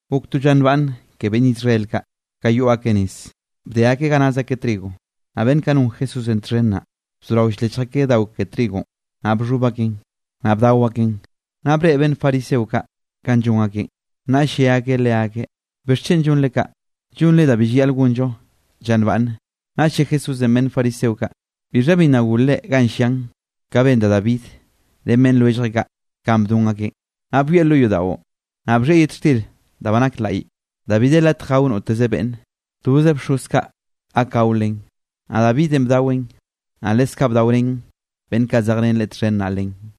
Gok to lla nbaꞌnne ke beꞌnn Israel kaꞌ, ka yoꞌ akeꞌ nez, bde akeꞌ ga naz akeꞌ trigo, naꞌ beꞌnn kaꞌ non Jesúsenꞌ txhen naꞌ, bzorao ll-lechj akeꞌ dao ke trigonꞌ, naꞌ bxhoꞌb akeꞌn, naꞌ bdao akeꞌn. Naꞌ breꞌe beꞌnn fariseo kaꞌ kanꞌ llon akeꞌn, naꞌll lle akeꞌ leakeꞌ: —¿Bixchen llonre kaꞌ? Llonre da bi llayaꞌl gonllo lla nbaꞌnne. Naꞌll lle Jesúsenꞌ beꞌnn fariseo kaꞌ: —¿Bixha bi nna golre ganꞌ llian, ka ben da Davidenꞌ ren beꞌnn lwelljeꞌ kaꞌ ka bdon akeꞌ? Kanꞌ byoeꞌ lo yodaꞌon, naꞌ bxhieꞌ yet xtir da ba nak laꞌy, da bi de latj gao noteze beꞌnne, toze bxoz kaꞌ gak gao len, naꞌ Davidenꞌ bdaweꞌn, naꞌ leskaꞌ bdaorén beꞌnn kaꞌ zejrén leꞌe txhen naꞌ len.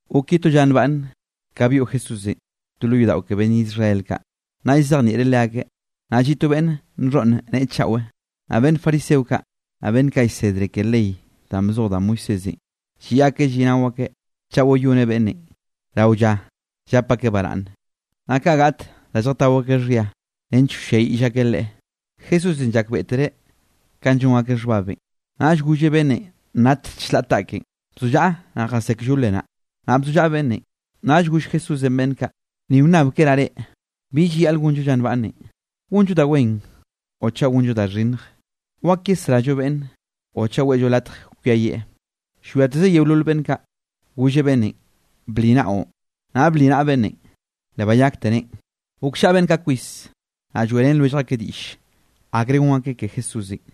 Gok ye to lla nbaꞌnne, ka byoꞌ Jesúsenꞌ to lo yodaꞌo ke beꞌnn Israel kaꞌ, naꞌ llzejnieꞌreꞌ leakeꞌ. Naꞌ lliꞌ to beꞌnn nxhoꞌn neꞌe chaꞌwe. Naꞌ beꞌnn fariseo kaꞌ, naꞌ beꞌnn kaꞌ llsedre ke ley danꞌ bzoj da Moisésenꞌ, lliꞌ akeꞌ lliꞌnao akeꞌ chaꞌ wayoneꞌ beꞌnnenꞌ rao lla llap akeꞌ baraꞌnne, naꞌ kaꞌ gaꞌt da lljatao akeꞌ xhia nench wlliayiꞌll akeꞌ Leꞌe. Jesúsenꞌ llakbeꞌtereꞌ kanꞌ llon akeꞌ xhbabenꞌ, naꞌll golleꞌ beꞌnnenꞌ nat chlaꞌ taꞌkeꞌn: —Bazollaꞌa, naꞌ jasé kllole naꞌ. Naꞌ bzollaꞌa beꞌnnenꞌ. Naꞌll goll Jesúsenꞌ beꞌnn kaꞌ: —Ni wnnabkeraꞌ reꞌ: ¿Bi llayaꞌl gonllo lla nbaꞌnnenꞌ, gonllo da wen o chaꞌ gonllo da xhinnj? ¿Wak yesrallo beꞌnn o chaꞌ weꞌllo latj kwiayieꞌ? Llwiateze yeolol beꞌnn kaꞌ, golleꞌ beꞌnnenꞌ: —Bli naꞌon. Naꞌ bli naꞌa beꞌnnenꞌ, le bayakte neꞌen. Gokllaꞌa beꞌnn kaꞌ kwis, naꞌ lloeꞌrén lwellj akeꞌ diꞌll akre gon akeꞌ ke Jesúsenꞌ.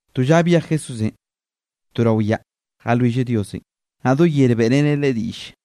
To lla byej Jesúsenꞌ to rao yaꞌ jalwilleꞌ Diosenꞌ, naꞌ do yer beꞌreneꞌ Leꞌe diꞌlle.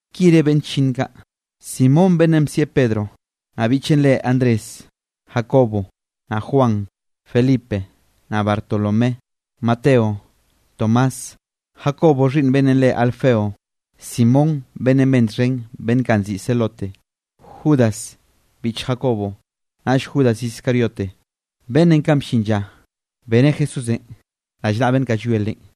Ki re beꞌnn chllinn kaꞌ: Simón beꞌnnenꞌ bsieꞌ Pedronꞌ, naꞌ biꞌcheꞌn re Andrés, Jacobo, naꞌ Juan, Felipe, naꞌ Bartolomé, Mateo, Tomás, Jacobo xhiꞌnn beꞌnnenꞌ re Alfeo, Simón beꞌnnenꞌ ben txhen beꞌnn kaꞌ nziꞌi Zelote, Judas biꞌch Jacobo, naꞌll Judas Iscariote beꞌnnenꞌ, kanꞌ bllin lla, beneꞌ Jesúsenꞌ rallnaꞌa beꞌnn kaꞌ llwie Leꞌen.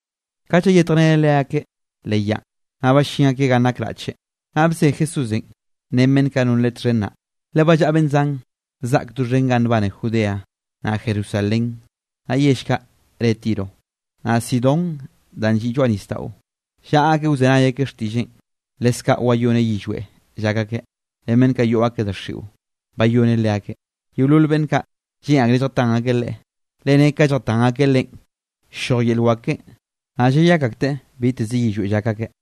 Ka llayetjreneꞌ leakeꞌ leꞌ yaꞌn, naꞌ ballín akeꞌ ganꞌ nak raꞌche, naꞌ bze Jesúsenꞌ ren beꞌnn kaꞌ non Leꞌen txhen naꞌ, le ba llaꞌa beꞌnn zan zaꞌk doxhen ga nbane Judea, naꞌ Jerusalén, naꞌ yell kaꞌ re Tiro, naꞌ Sidón danꞌ lliꞌ lloaꞌ nisdaꞌo. Llaꞌa akeꞌ wzenay akeꞌ xtiꞌlleꞌn, leskaꞌ wayoneꞌ yillweꞌ llak akeꞌ. Ren beꞌnn yoꞌ akeꞌ daxiꞌo, bayoneꞌ leakeꞌ. Yeolol beꞌnn kaꞌ, lleꞌn akreꞌ lljatan akeꞌ Leꞌe, le ne ka lljatan akeꞌ Leꞌen, ll-lloj yel wak keꞌen, naꞌ llayak akteꞌ biteze yillweꞌ llak akeꞌ.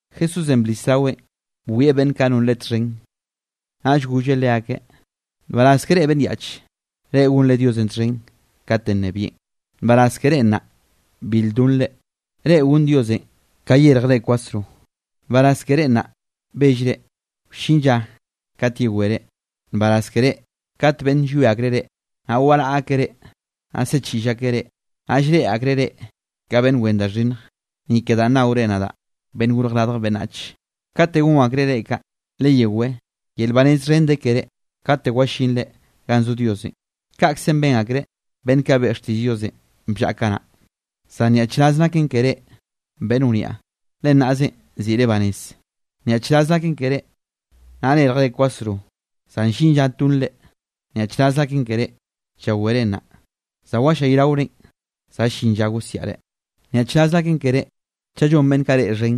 Jesúsenꞌ blis raweꞌn bwieꞌ beꞌnn kaꞌ non Leꞌe txhen, naꞌll golleꞌ leakeꞌ: —Nbaraz ke reꞌ beꞌnn yaꞌche, reꞌ gonre Diosenꞌ txhen katenꞌ nnebieꞌn. ’Nbaraz ke reꞌ nnaꞌ bil donre, reꞌ gon Diosenꞌ ka yérjere kwasro. ’Nbaraz ke reꞌ nnaꞌ bellre, wllin lla kate yewere. ’Nbaraz ke reꞌ kate beꞌnn llwie akreꞌ reꞌ, naꞌ waraꞌa akeꞌ reꞌ, naꞌ ziꞌchiꞌll akeꞌ reꞌ, naꞌ llreꞌe akreꞌ reꞌ ka beꞌnn wen da xhinnj, ni ke danꞌ naore nadaꞌ Beꞌnnenꞌ Gorj Radj Beꞌnnach. Katenꞌ gon akreꞌ reꞌ kaꞌ, leyewé, yel banez xhen de keré kate wallinre ganꞌ zo Diosenꞌ. Kaꞌkzenꞌ ben akreꞌ beꞌnn kaꞌ beꞌe xtiꞌll Diosenꞌ bllaꞌa kanaꞌ. ’Zan nyaꞌchraz naken ke reꞌ, beꞌnn wniaꞌ, le nnaꞌzenꞌ ziꞌre banez. ’Nyaꞌchraz naken ke reꞌ, nnaꞌ nérjere kwasro, za llin lla tonrenꞌ. ’Nyaꞌchraz naken ke reꞌ, llawere nnaꞌ, za wallayraorenꞌ, za llin lla gosiaꞌre. ’Nyaꞌchraz naken ke reꞌ, chaꞌ llon beꞌnn kaꞌ reꞌ xhen,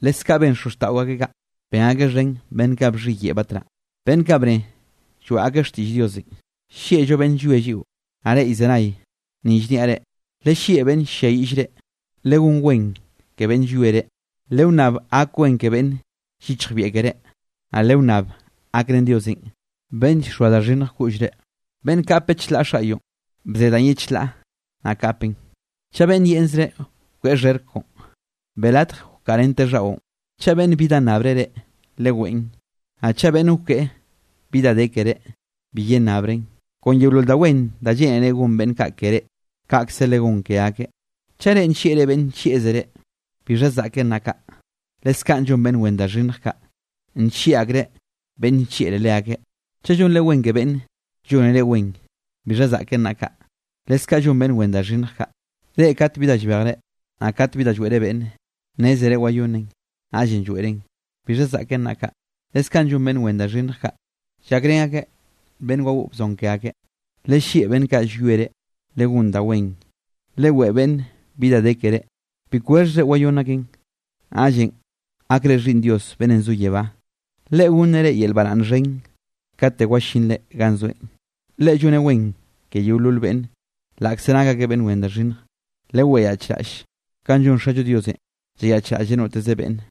leskaꞌ ben xozxtaꞌo akeꞌ kaꞌ, ben akeꞌ xhen beꞌnn kaꞌ bxhiyeꞌe batnaꞌ, beꞌnn kaꞌ bne lloeꞌ akeꞌ xtiꞌll Diosenꞌ. ’Naꞌ reꞌ llzenay, ni llniaꞌ reꞌ: Lellieꞌ beꞌnn ll-lliayiꞌll reꞌ, legón wen ke beꞌnn llwie reꞌ. Lewnnab gak wen ke beꞌnn yichjbieꞌ keré, naꞌ lewnnab gakrén Diosenꞌ beꞌnn llxoa da xhinnj koꞌllre. Beꞌnn kape chlaꞌ xaꞌyoꞌn, bze danꞌ ye chlaꞌ naꞌ kapeꞌn. Chaꞌ beꞌnn yeꞌnzreꞌ wkeꞌe xherk koꞌon, beꞌe latj wkaꞌa rente xhaꞌon. Chaꞌ beꞌnn bi da nnabre reꞌ, leweꞌn, naꞌ chaꞌ beꞌnn wkeꞌe bi da de keré, bi yennabren. Kon yeolol da wen da lleꞌnere gon beꞌnn kaꞌ ke reꞌ, kaꞌkze legón ke akeꞌ. ’Chaꞌ reꞌ nllieꞌre beꞌnn nllieꞌzre reꞌ, ¿bixha zaꞌken naꞌ kaꞌ? Leskaꞌ llon beꞌnn wen da xhinnj kaꞌ, nllieꞌ akreꞌ beꞌnn nllieꞌre leakeꞌ. Chaꞌ llonre wen ke beꞌnn llone reꞌ wen, ¿bixha zaꞌken naꞌ kaꞌ? Leskaꞌ llon beꞌnn wen da xhinnj kaꞌ. Reꞌ kate bi da llbejre, naꞌ kat bi lloeꞌre beꞌnne, nnézere wayonneꞌn, naꞌllenꞌ lloeꞌren, ¿bixha zaꞌken naꞌ kaꞌ? Leskaꞌ llon beꞌnn wen da xhinnj kaꞌ, llakrén akeꞌ beꞌnn wagoꞌ wzon ke akeꞌ. Lellieꞌ beꞌnn kaꞌ llwie reꞌ, legón da wen, leweꞌe beꞌnne bi da de keré, bi kwexhzre wayónn akeꞌn, naꞌllenꞌ gakre xhiꞌnn Dios beꞌnnenꞌ zo yebá, Leꞌe gonneꞌ reꞌ yel baraꞌnn xhen kate wallinre ganꞌ zoeꞌn. Leꞌe lloneꞌ wen ke yeolol beꞌnne, laꞌkze nak akeꞌ beꞌnn wen da xhinnj. Lewayaꞌchraꞌll, kanꞌ llon Xallo Diosenꞌ llayaꞌchraꞌlleꞌ noteze beꞌnn.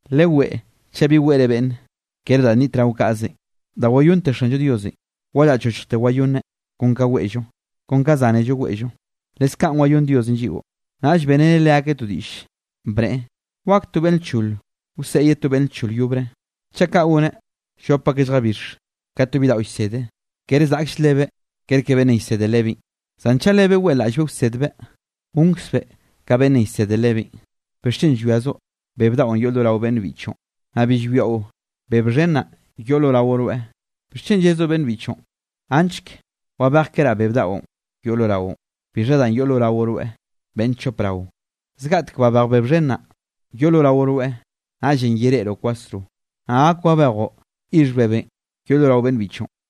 Leweꞌe, chaꞌ bi weꞌre beꞌnne, ker da nnitrao kaꞌzenꞌ, da wayonnte Xanllo Diosenꞌ, wa llaꞌchochjte wayonneꞌ, kon ka weꞌllo, kon ka zánello weꞌllo, leskaꞌn wayónn Diosenꞌ lliꞌo. Naꞌll beꞌreneꞌ leakeꞌ to diꞌll, bneꞌe: —¿Wak to beꞌnn lchol wseꞌe ye to beꞌnn lchol yobre? Chaꞌ kaꞌ goneꞌ, llop akeꞌ lljabix. Ka to bidaꞌo llsede, kere zaꞌkll lebeꞌ kerke beꞌnnenꞌ llsede lebeꞌn, zan chaꞌ lebeꞌ weꞌlaꞌllbeꞌ wsedbeꞌ, gonkzbeꞌ ka beꞌnnenꞌ llsede lebeꞌn. ’¿Bixchen llwiazoꞌ beb daꞌon yoꞌ lo rao beꞌnn biꞌchoꞌn, naꞌ bi llwiaꞌo beb xhen naꞌ, yoꞌ lo rao rweꞌ? ¿Bixchen yezoꞌ bibiꞌchoꞌn: “Anchk wabejkeraꞌ beb daꞌon yoꞌ lo raoꞌn?” ¿Bixha danꞌ yoꞌ lo rao rweꞌ, beꞌnn chop rao? Zgaꞌtek babej beb xhen naꞌ, yoꞌ lo rao rweꞌ, naꞌllenꞌ yereꞌroꞌ kwasro, naꞌ gak wabejoꞌ yixh bebenꞌ yoꞌ lo rao beꞌnn biꞌchoꞌn.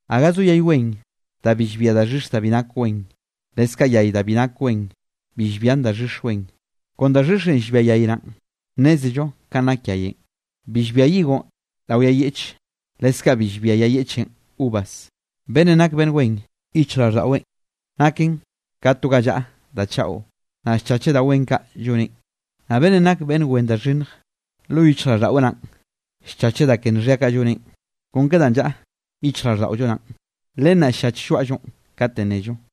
’Gaga zo yay wen da llbia daxhix da bi nak wen, leskaꞌ yay da bi nak wen, bi llbian daxhix wen. Kon da xhixenꞌ llbia yay naꞌn, nnézello ka nak yayenꞌ. Bi llbia higo rao yay yeꞌche, leskaꞌ bi llbia yay yeꞌche uvas. Beꞌnnenꞌ nak beꞌnn wen, yichjraꞌlldaꞌweꞌn naken ka to ga llaꞌa da chaꞌo, naꞌn llchacheꞌ da wen kaꞌ lloneꞌn. Naꞌ beꞌnnenꞌ nak beꞌnn wen da xhinnj, lo yichjraꞌlldaꞌweꞌ naꞌn, llchacheꞌ da ke nxhia kaꞌ lloneꞌn. Kon ke danꞌ llaꞌa yichjraꞌlldaꞌollo naꞌn, len naꞌn ll-llach lloaꞌllonꞌ kate nnello.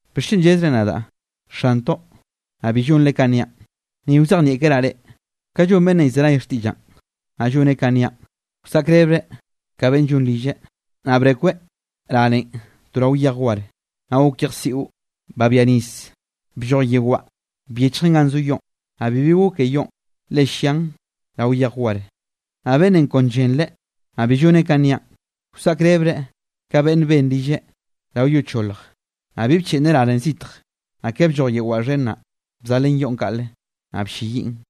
’¿Bixchen llezre nadaꞌ: “Xantoꞌ” naꞌ bi llonre kanꞌ niaꞌn? Ni wzejnieꞌkeraꞌ reꞌ, ka llon beꞌnnenꞌ llzenay xtiꞌllaꞌn, naꞌ lloneꞌ kaꞌn niaꞌn. Wsaꞌkrebeꞌ ka beꞌnn llon rilleꞌ, naꞌ brekweꞌ ranen to rao yej war. Naꞌ gok yejsiꞌo, babia nis, blloj yeo waꞌa byechjen ganꞌ zo yoꞌn, naꞌ bibi goke yoꞌn, le llian rao yej war. Naꞌ beꞌnnenꞌ kon llenreꞌ, naꞌ bi lloneꞌ kanꞌ niaꞌn, wsaꞌkrebeꞌ ka beꞌnnenꞌ ben rilleꞌ rao yo cholj, naꞌ bi bcheꞌnneꞌ ranen zitj, naꞌ ke blloj yeo waꞌa xhen naꞌ, bzalen yoꞌn kaꞌle, naꞌ blleyiꞌn.